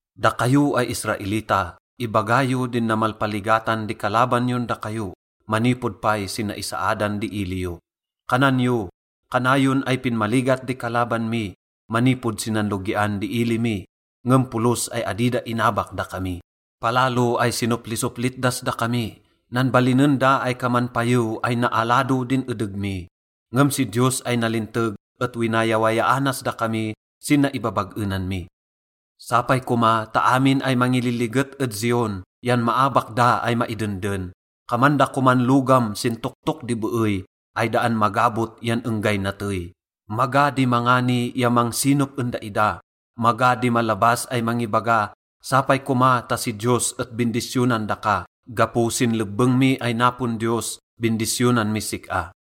Dakayo ay Israelita, ibaga yo din namalpaligatan di kalaban yon dakayo manipod pay sin naisaadan di ili yo. Kanan yo, “Kanayon ay pinmaligat di kalaban mi manipod sin nanlogian di ili mi, ngem polos ay adi da inabak dakami. Palalo ay sinoplisoplit das dakami, nanbalinen da ay kaman payew ay naalado din edeg mi. Ngem si Diyos ay nalinteg et winayawayaanas dakami sin naibabag-enan mi.” Sapay koma ta amin ay mangililiget ed Zion yan maabak da ay maidenden. Kaman da koman logam sin toktok di beey ay daan magabot yan enggay natey. Maga di mangani ya mangsinop en daida. Maga di malabas ay mangibaga, “Sapay koma ta si Diyos et bindisyonan daka. Gapo sin lebbeng mi ay napon Diyos, bindisyonan mis sik-a.”